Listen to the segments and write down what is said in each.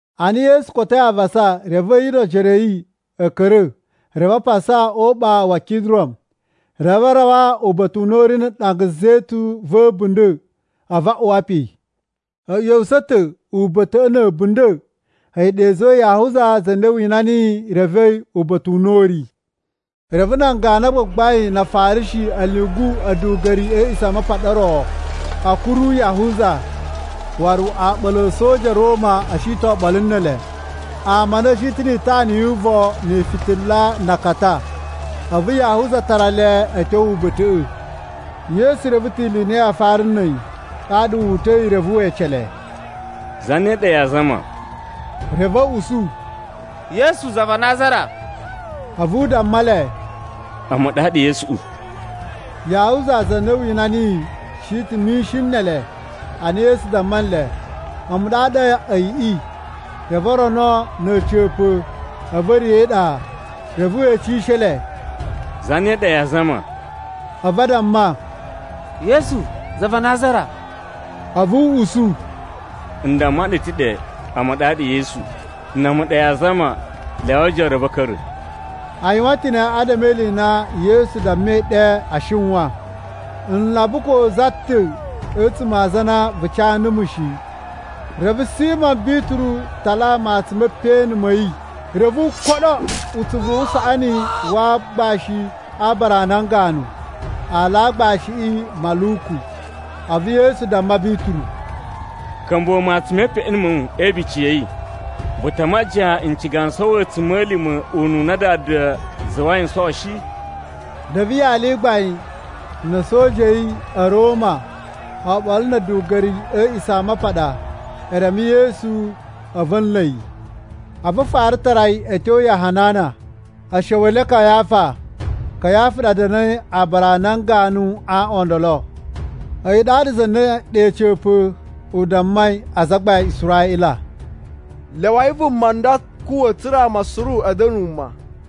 Ana Yesu kotoi avasa, reve a̱yi no ojoro a̱ yi a̱ ka̱ra̱ reve a pasa Uɓaa wa̱ Kidron. Reve a rawa uba̱ta̱ u na u ri na̱ ɗanga zetun va̱ a̱bunda̱ a̱vu a uwa pe. A̱ ꞌya̱wusa̱ ta̱ uba̱ta̱ꞌa̱ na̱ a̱bunda̱, a̱yi ɗa i zuwai Yahuza za na wina niyi revei uba̱ta̱ u na a̱ ri. Reve nan ganu a gbagbain na Afarishi a̱ lyungu a̱duga̱ri a̱ A̱a̱ꞌisamapaɗa o ro a̱ kuru Yahuza. Waru oɓolo a̱ a̱soja a̱ Roma a̱ shi ta̱ oɓolo ne ele, ama a nda a̱ shi ta̱ ni itana yu uvon ni ifitila na akata. A̱vu Yahuza tara le a̱ tyo uba̱ta̱ꞌa̱. Yesu reve ta̱ ili i na yaa fara na̱ a̱yi, ɗaɗa wu uta̱i reve we ece le, “Zane ɗa yaa zama?” Reve a̱ usu, “Yesu za va Nazara.” A̱vu u damma le, “A̱mu ɗaɗa Yesuꞌu!” (Yahuza za na wina niyi, shi ta̱ mishin ne ele.) Ana Yesu damma nle, “A̱mu ɗaɗa a̱yiꞌi,” reve o rono na̱ a̱ca̱pa̱ a̱vu a̱ riya̱ e iɗa. Reve we ecishe le, “Zane ɗa yaa zama?” A̱vu a damma, “Yesu za va Nazara.” A̱vu u usu, “N damma ɗu ta̱ ɗe a̱mu ɗaɗa Yesu. Na̱ a̱mu ɗa yaa zama, lyawai ojoro a̱ va̱ a̱ ka̱ra̱.” A yuwan ta̱ ne adama e ili i na Yesu dammai ɗe a shiwan, “N lamba ko za ta̱ a̱tsuma̱ a aza na vu ca numu shi.” Reve Simo Bituru tala matsun me peꞌeni ma̱ yi reve u koɗo utsuvu wu usaꞌani wa aagbashi a aabara a nan ganu. (Aala a aagbashiꞌi Maluku.) A̱vu Yesu damma Bituru, “Ka̱mbuwa̱ matsun me peꞌeni ma̱ wu e ibici ya̱ yi. Vu ta a majiyan n ciga n sowo a̱tsuma̱lima̱ ununa Dada zuwai n sowo shi?” Reve yali i gbain na̱ a̱soja a̱ yi a̱ Roma, oɓolo na̱ a̱duga̱ri a̱ A̱a̱ꞌisamapaɗa, e reme Yesu a̱vu a̱ nla̱ yi. A̱vu a fara tara yi a̱ tyo ya Hanana, a̱sha̱wa̱le Kayafa. Kayafa ɗa da̱na̱i aabara a nan ganu a aaꞌwan o ndolo. A̱yi ɗaɗa za na ɗe a̱ca̱pa̱ u dammai azagbain a Israꞌila, “Lyawai vuma nda kuwa̱ tsa̱ra̱ ama suru a̱ da̱na̱ wuma.”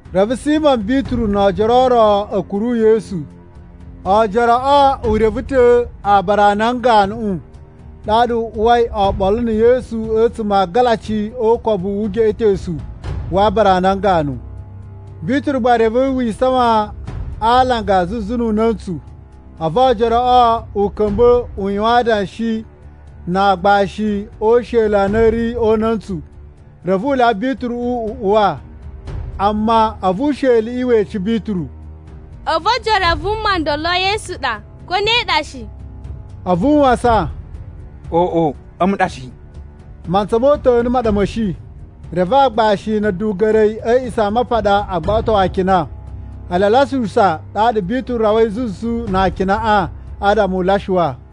Reve Simo Bituru no oojoro o ro a̱ kuru Yesu. Oojoroꞌo u reve ta̱ aabara a nan ganuꞌu, ɗaɗa u uwai oɓolo na̱ Yesu a̱tsuma̱ a agalaci o ukobu wu ugeꞌetosu wa aabara a nan ganu. Bituru gba reve wi isawan a alanga zuzu nu una̱ntsu. A̱vu oojoroꞌo u ka̱mba̱ u yuwan adanshi na aagbashi o usheli a na a̱ ri o una̱ntsu. Reve a lyawa Bituru u uwa. Amma a̱vu usheliꞌi we ece Bituru, “A̱vu oojoro a vuma ndolo Yesu ɗa, ko ne ɗa shi?” A̱vu u wasan, “Oꞌo, a̱mu ɗa shi!” Mantsa mo uta̱nu ma ɗa ma̱ shi, reve agbashi na̱ a̱duga̱ri a̱ A̱a̱ꞌisamapaɗa a gbaꞌato akina. Ele a lyasuwusa, ɗaɗa Bituru rawai zuzu na akinaꞌa adama u lyasuwa.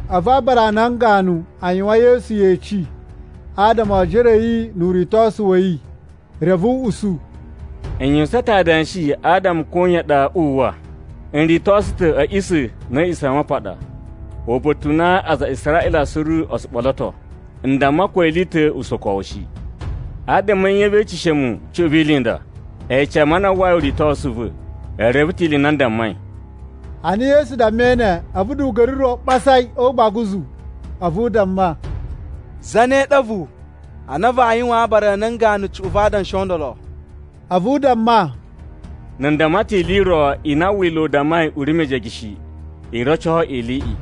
A̱vu aabara a nan ganu a yuwan Yesu yeci adama o ojoro a̱ yi nu uritosu wa̱ yi. Reve u usu, “N yuwusan ta̱ adanshi adama koyan ɗa uwwa. N ritosu ta̱ a̱ a̱ꞌisa̱ na̱ a̱ A̱a̱ꞌisamapaɗa, uba̱ta̱ u na aza a Israꞌila suru o tsu ɓoloto. N damma ko ili i ta̱ usokowu shi. Adama a̱ nye vee eceshe mu cuꞌun vi ili i nda? Ece ama a na a uwwai uritosu u va̱. E reve ta̱ ili i na n dammai.” Ana Yesu dammai ne, a̱vu duga̱ri ro ɓasa yi o ugbaguzu a̱vu u damma, “Zane ɗa a̱vu a na vaa yuwaan aabara a nan ganu cuꞌun va adanshi o ndolo?” A̱vu u damma, “Na̱ n damma ta̱ ili i ro i na Wila̱ u dammai u ri mejege shi, i roco iliꞌi.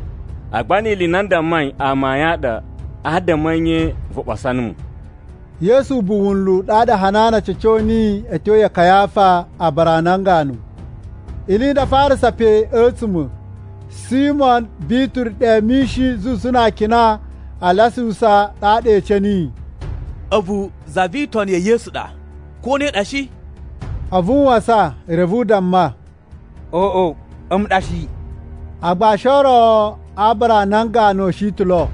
Agba ni ili i na n dammai amayun a ɗa, adama a̱ nye vu ɓasa numu?” Yesu ubuwu wunlu ɗaɗa Hanana ca̱co niyi a̱ tyo ya Kayafa aabara a nan ganu. Ili i nda a farasa pe a̱tsuma̱, Simo Bituru ɗe mishin zuzu na akina a lyasuwusa. Ɗaɗa e ece niyi, “A̱vu za vi itoni ya̱ Yesu ɗa, ko ne ɗa shi?” A̱vu u wasan reve u damma, “Oꞌo, a̱mu ɗa shi!” Aagbashi o ro a aabara a nan ganu a̱ shi ta̱ lo.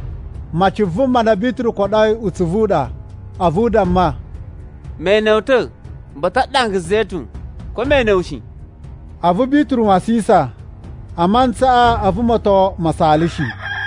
Maci vuma na Bituru koɗoi utsuvu u ɗa. A̱vu u damma, “Me ene wu ta̱ uba̱ta̱ a ɗanga zetun, ko me ene wu shi?” A̱vu Bituru wasisan, a mantsaꞌa a̱vu moton ma saalashi.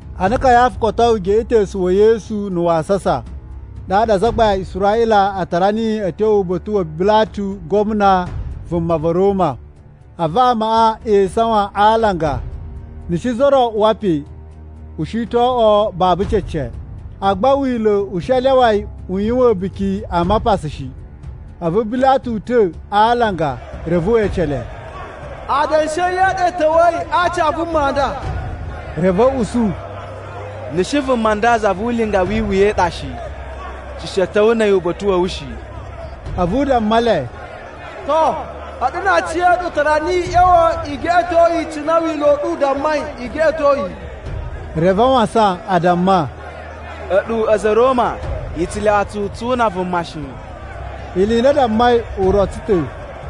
Ana Kayafa kotoi ugeꞌetosu wa̱ Yesu na̱ wasasa, ɗaɗa azagbain a Israꞌila a tara niyi a̱ tyo uba̱ta̱ wa Bilatu gwamna vuma va̱ Roma. A̱vu amaꞌa e isawan a alanga. Na̱ shi za ro uwa pe, u shi to oꞌwo babu cece, agba Wila̱ u shi a lyawa yi u yuwan A̱buki a Mapasa shi. A̱vu Bilatu uta̱ a alanga reve we ece le, “Adanshi a̱ nye a ɗa i ta̱wa̱yi a aci a vuma nda?” Reve a̱ usu, “Na̱ shi vuma nda za vu ulinga wi iwuya i ɗa shi, tsu shi a̱ ta̱wa̱ na̱ a̱yi uba̱ta̱ wa̱ wu shi.” A̱vu u damma le, “To, a̱ɗu na aciya̱ɗu tara niyi i ꞌya̱wa̱ i geꞌeto yi cine Wila̱ u ɗu u dammai i geꞌeto yi.” Reve a wasan a damma, “A̱ɗu a̱za̱ a̱ Roma i tsu lyawa tsu tsu una vuma shi.” Ili i na a dammai u roco ta̱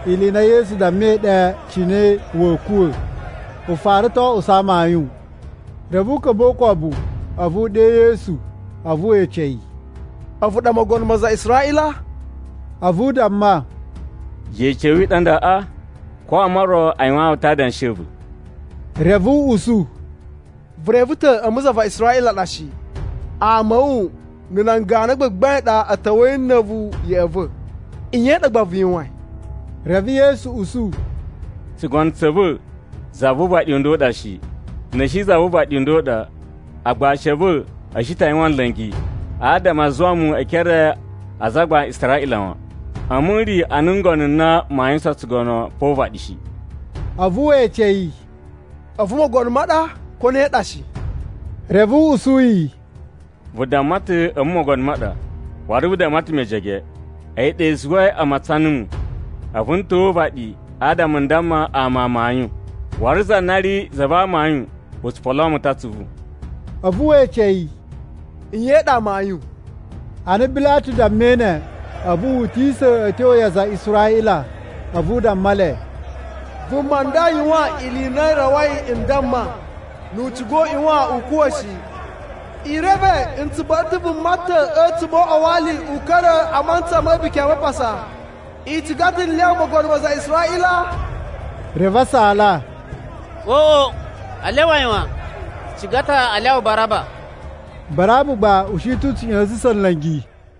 ili i na Yesu dammai ɗe cine wa̱a̱ kuwa̱ u fara ta̱ o oꞌuso amayun. Reve u ka̱mba̱ o ukobu a̱vu u ɗe Yesu a̱vu we ece yi, “A̱vu ɗa mogono ma aza a Israꞌila?” A̱vu u damma, “Yeci ya̱ wu i ɗa ndaꞌa, ko ama o ro a yuwaan wu ta̱ adanshi a̱ va̱?” Reve u usu, “Vu reve ta̱ a̱mu za va Israꞌila ɗa shi! Ama a̱ wu na̱ nan ganu a gbagbain a ɗa a̱ ta̱wa̱i na̱ a̱vu ya̱ꞌa̱ va̱. Nye i ɗa gba vu yuwain?” Reve Yesu usu, “Tsugono tsa̱ va̱ za vu uvaɗi u nda u ɗa shi. Na̱ shi za vu uvaɗi u nda u ɗa, agbashi a̱ va̱ a̱ shi ta yuwan nla̱ngi adama a zuwa mu e ekere a azagbain a Israꞌila wan. A̱mu n ri ana ngono n na maa yuwusan tsugono pa o uvaɗi shi.” A̱vu we ece yi, “A̱vu mogono ma ɗa, ko ne ɗa shi?” Reve u usu yi, “Vu damma ta̱ a̱mu mogono ma ɗa, waru vu damma ta̱ mejege. A̱yi ɗa i zuwai a matsan numu, a̱vu n ta̱wa̱ o uvaɗi adama n damma ama amayun. Waru za na ri za va amayun tsu poloo mu ta̱ atsuvu.” A̱vu we ece yi, “Nye i ɗa amayun?” Ana Bilatu dammai ne, a̱vu wu utisa̱ a̱ tyo ya aza a Israꞌila a̱vu u damma le, “Vuma nda yuwan ili i na i rawai n damma, ‘Nu u ciga u ꞌyuwan u kuwa̱’ shi. I reve n tsu ba̱ɗa̱ ta̱ vuma ta̱ a̱tsuma̱ o uꞌwa wa ali u ka̱ra̱ a mantsa ma̱ A̱buki a Mapasa. I ciga ta̱ n lyawa ‘mogono ma aza a Israꞌila?’” Reve a saala, “Oꞌo, a lyawa yi wan! Tsu ciga ta̱ a lyawa Baraba.” (Baraba gba u shi ta̱ u tsu ꞌya̱sa̱sa̱n nla̱ngi.)